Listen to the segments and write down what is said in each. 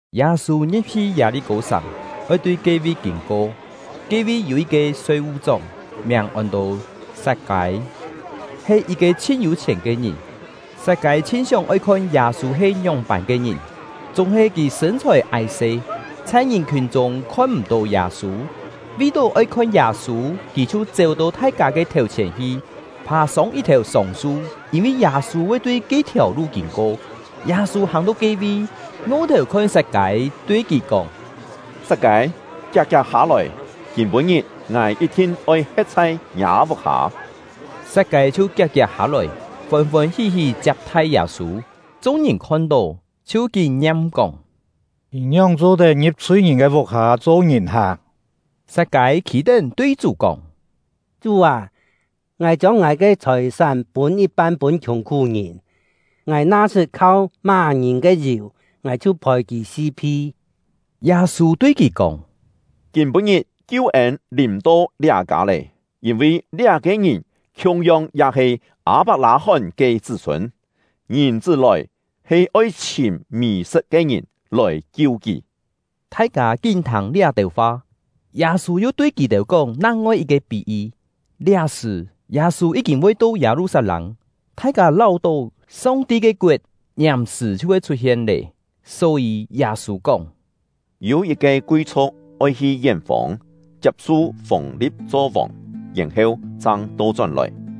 Yâ-sû ngi̍p-hi Yâ-li-kô-sàng, oi tui ke-vi kîn-ko. Ke-vi yû yit-ke soi-vu-chóng, miàng ôn-to Sat-kâi, he yit-ke chhin yû-chhièn ke ngìn. Sat-kâi chhin sióng-oi khon Yâ-sû he ngióng-pân ke ngìn, chúng-he kì sṳ̂n-chhòi ái-se, chhai ngìn-khiùn chûng khon-m̀-tó Yâ-sû. Vi-tó oi khon Yâ-sû, kì chhiu chéu-to thai-kâ ke thèu-chhièn hi, phà-sông yit-thèu sông-su; yîn-vi Yâ-sû voi tui ke-thiàu lu kîn-ko. Yâ-sû hàng-to ke-vi, ngo-thèu khon Sat-kâi, tui kì kóng: “Sat-kâi, kiak-kiak hâ-lòi! Kîm-pû-ngit ngài yit-thin oi he̍t chhai ngiâ vuk-hâ.” Sat-kâi chhiu kiak-kiak hâ-lòi, fôn-fôn hí-hí chiap-thai Yâ-sû. Chung-ngìn khon-tó, chhiu kín ngiam kóng: “Kì ngióng cho-tet ngi̍p chhui-ngìn ke vuk-hâ cho ngìn-hak!” Sat-kâi khî-tén tui Chú kóng: “Chú â, ngài chiông ngài ke chhòi-sán pûn yit-pan pûn khiùng-khú-ngìn; ngài na sṳt khau má-ngìn ke yù, ngài chhiu phòi kì si-phi.” Yâ-sû tui kì kóng: “Kîm-pû-ngit kiu-ên lìm-to liá kâ lé, yîn-vi liá-ke ngìn khiung-yong ya he Â-pak-lâ-hón ke chṳ́-sûn. Ngìn-chṳ́ lòi, he oi chhìm mì-sṳt ke ngìn, lòi kiu kì.” Thai-kâ kín thâng liá-têu fa, Yâ-sû yu tui kì-têu kóng nang-ngoi yit-ke pí-yi. Liá-sṳ̀, Yâ-sû yí-kîn voi to Yâ-lu-sat-lâng, thai-kâ láu-tó Song-ti ke koet ngiàm-sṳ̀ chhiu voi chhut-hien lé. Só-yî, Yâ-sû kóng: “Yû yit-ke kui-chhu̍k oi hi yén-fông, chiap-su fûng-li̍p cho vòng, yèn-heu chang to-chón-lòi.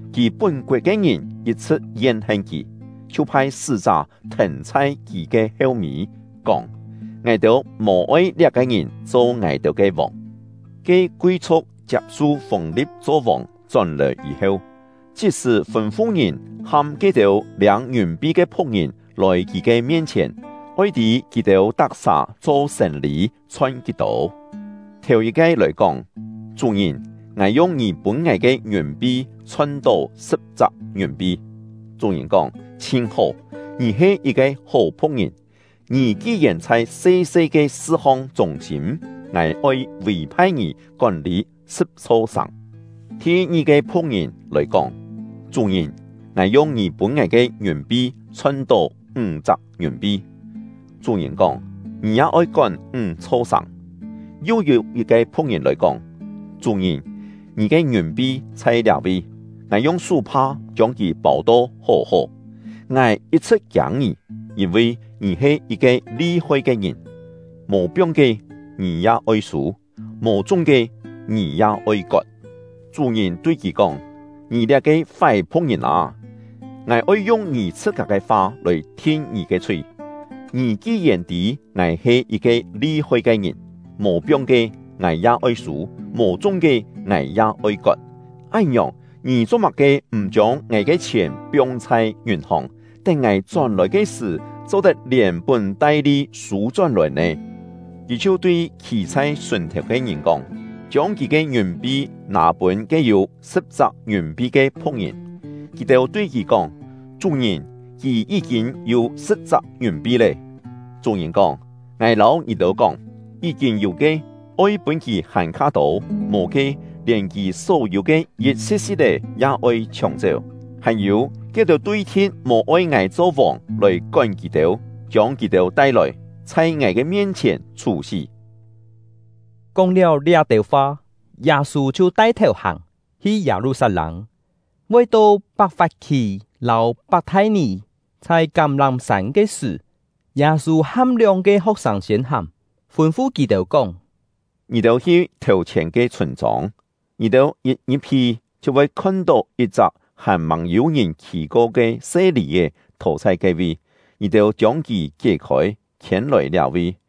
Kì pún-koet ke ngìn yit-chhṳ̍t yen-hen kì, chhiu phai sṳ́-chá thèn chhai kì ke heu-mî, kóng: ‘Ngài-têu mò-oi liá-ke ngìn cho ngài-têu ke vòng.’ “Ke kui-chhu̍k chiap-su fûng-li̍p cho vòng chón-lòi yî-heu, chit-sṳ̀ fûn-fu ngìn ham ke-têu liâng ngiùn-pi ke phu̍k-ngìn lòi kì ke mien-chhièn, oi tî kì-têu tak-sà cho sên-lî chhon kí-tô. Thèu-yit-ke lòi kóng: ‘Chú-ngìn, ngài yung ngì pûn ngài ke ngiùn-pi chhon-tó sṳ̍p-chak ngiùn-pi.’ Chú-ngìn kóng: ‘Chhin hó! Ngì he yit-ke hó phu̍k-ngìn; ngì ki-yèn chhai se-se ke sṳ-hong chûng-sîm, ngài oi vî-phai ngì kón-lî sṳ̍p-chho sàng.’ Thi-ngi-ke phu̍k-ngìn lòi kóng: ‘Chú-ngìn, ngài yung ngì pûn ngài ke ngiùn-pi chhon-tó ńg-chak ngiùn-pi.’ Chú-ngìn kóng: ‘Ngì ya oi kón ńg-chho sàng.’ “Yu yû yit-ke phu̍k-ngìn lòi kóng: ‘Chú-ngìn, ngì ke ngiùn-pi chhai liá-vi; ngài yung sú-pha chiông kì pâu-to hó-hó. Ngài yit-chhṳ̍t kiâng ngì, yîn-vi ngì he yit-ke li-hoi ke ngìn: Mò piong ke, ngì ya oi sû; mò chung ke, ngì ya oi kot.’ Chú-ngìn tui kì kóng: ‘Ngì liá-ke fái phu̍k-ngìn â! Ngài oi yung ngì chhṳ-kâ ke fa lòi thin ngì ke chhui! Ngì ki-yèn tî ngài he yit-ke li-hoi ke ngìn: Mò piong ke, ngài ya oi sû; mò chung ke, ngài ya oi kot. Án-ngiòng, ngì cho-má-ke m̀ chiông ngài ke chhièn piong chhai ngiùn-hòng, tén ngài chón-lòi ke sṳ̀, cho-tet lièn-pún-tai-li sû-chón-lòi nè?’ “Kì chhiu tui khî chhai sùn-thèu ke ngìn kóng: ‘Chiông kì ke ngiùn-pi nâ pûn ke yû sṳ̍p-chak ngiùn-pi ke phu̍k-ngìn!’ Kì-têu tui kì kóng: ‘Chú-ngìn, kì yí-kîn yû sṳ̍p-chak ngiùn-pi lé!’ Chú-ngìn kóng: ‘Ngài lâu ngì-têu kóng, yí-kîn yû ke, oi pûn kì hàn-kha tô; mò ke, lièn kì só-yû ke yit-si̍t-si̍t-é ya oi chhióng-chéu. Hàn-yû, ke-têu tui-thi̍t mò-oi ngài cho vòng lòi kón kì-têu, chiông kì-têu tai-lòi, chhai ngài ke mien-chhièn chhú-sí!’” Kóng-liáu liá-têu fa, Yâ-sû chhiu tai-thèu hàng, hi Yâ-lu-sat-lâng. Voi to Pak-fap-khì lâu Pak-thai-nì, chhai Kám-lám-sân ke sṳ̀, Yâ-sû ham lióng-ke ho̍k-sâng siên hàng, fûn-fu kì-têu kóng: “Ngì-têu hi thèu-chhièn ke chhûn-chông. Ngì-têu yit ngi̍p-hi, chhiu voi khon-tó yit-chak hàn-màng yû-ngìn khì-ko ke se lì-è thò chhai ke-vi. Ngì-têu chiông kì kié-khôi, khiên-lòi liá-vi.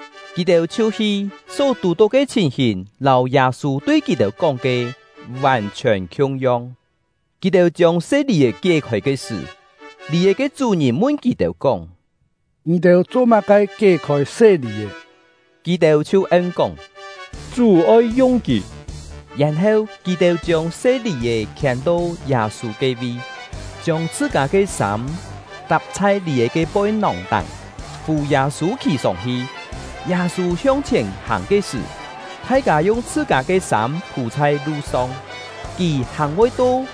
Kì-têu chhiu hi, só tù-tó ke chhìn-hìn lâu Yâ-sû tui kì-têu kóng ke vàn-chhiòn khiung-yong. Kì-têu chiông se lì-è kié-khôi ke sṳ̀, lì-è ke chú-ngìn mun kì-têu kóng: “Ngì-têu cho-má-ke kié-khôi se lì-è?” Kì-têu chhiu en-kóng: “Chú oi yung kì.” Yèn-heu, kì-têu chiông se lì-è khiên-to Yâ-sû ke-vi, chiông chhṳ-kâ ke sâm tap chhai lì-è ke poi-nòng-táng, fù Yâ-sû khì sông-hi. Yâ-sû hiong-chhièn hàng ke sṳ̀, thai-kâ yung chhṳ-kâ ke sâm phû chhai lu-song. Kì hàng voi to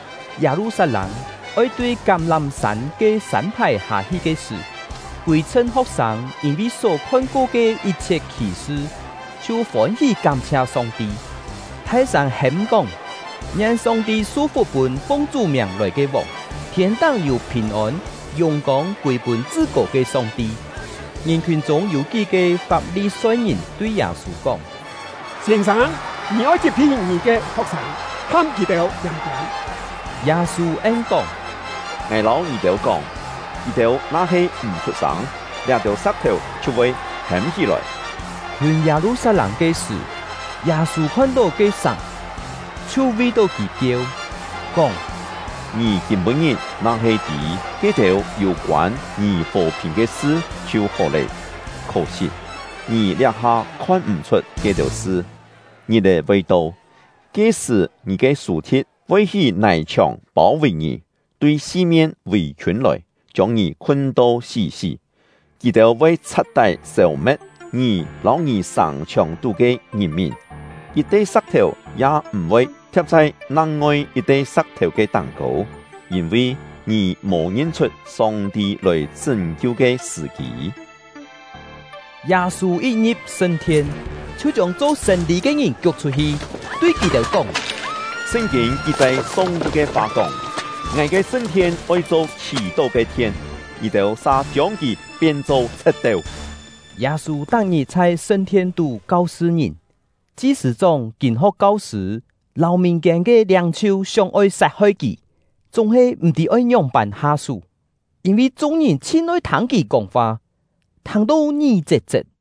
Yâ-lu-sat-lâng, oi tui Kám-lám-sân ke sân-phài hâ-hi ke sṳ̀, kûi-chhṳn ho̍k-sâng yîn-vi só khon-ko ke yit-chhiet khì-sṳ chhiu fôn-hí kám-chhia Song-ti, thai-sâng hêm-kóng: Ngien Song-ti su-fuk pûn fung Chú miàng lòi ke vòng! Thiên-táng yû phìn-ôn, yùng-kông kûi pûn Chṳ-kô ke Song-ti! Ngìn-khiùn chûng yû kí-ke Fap-li-soi-ngìn tui Yâ-sû kóng: “Sîn-sâng, ngì oi chit-phi ngì ke ho̍k-sâng, ham kì-têu tiâm-tiâm!” Yâ-sû en-kóng: “Ngài lâu ngì-têu kóng, kì-têu na-he m̀ chhut-sâng, liá-têu sa̍k-thèu chhiu voi hêm hí-lòi.” Khiûn Yâ-lu-sat-lâng ke sṳ̀, Yâ-sû khon-tó ke-sàng, chhiu vi-tó kì kieu, kóng: “Ngì kîm-pû-ngit na-he tî ke-têu yû-koân ngì fò-phìn ke sṳ chhiu hó lé! Khó-sit, ngì liá-ha khon m̀-chhut ke-têu sṳ. Ngit-è voi to, ke-sṳ̀ ngì ke sù-thi̍t voi hí nài-chhiòng pâu-vì ngì, tui si-mien vì-khiûn lòi, chiông ngì khun-to sí-sí. Kì-têu voi chha̍t-tái sêu-me̍t ngì lâu ngì sàng-chhiòng-tú ke ngìn-mìn, yit-te sa̍k-thèu ya m̀-voi thia̍p chhai nang-ngoi yit-te sa̍k-thèu ke táng-kô, yîn-vi ngì mò ngin-chhut Song-ti lòi chṳ́n-kiu ke sṳ̀-kî.” Yâ-sû yit ngi̍p sṳn-thien, chhiu chiông cho sên-lî ke ngìn kiuk chhut-hi, tui kì-têu kóng: “Sṳn-kîn ki-chai Song-ti ke fa kóng: ‘Ngài ke sṳn-thien oi cho khì-tó ke thien’, ngì-têu sa chiông kì pien-cho chhe̍t-teu!” Yâ-sû tak-ngit chhai sṳn-thien-tú kau-sṳ ngìn. Chi-sṳ̂-chóng, kîn-ho̍k kau-sṳ̂, lâu mìn-kiên ke liâng-chhiu sióng-oi sat-hoi kì, chúng-he m̀-tî oi ngióng-pân ha-sú; yîn-vi chung-ngìn chhin-oi thâng kì kóng-fa, thâng-to ngí-chet-chet.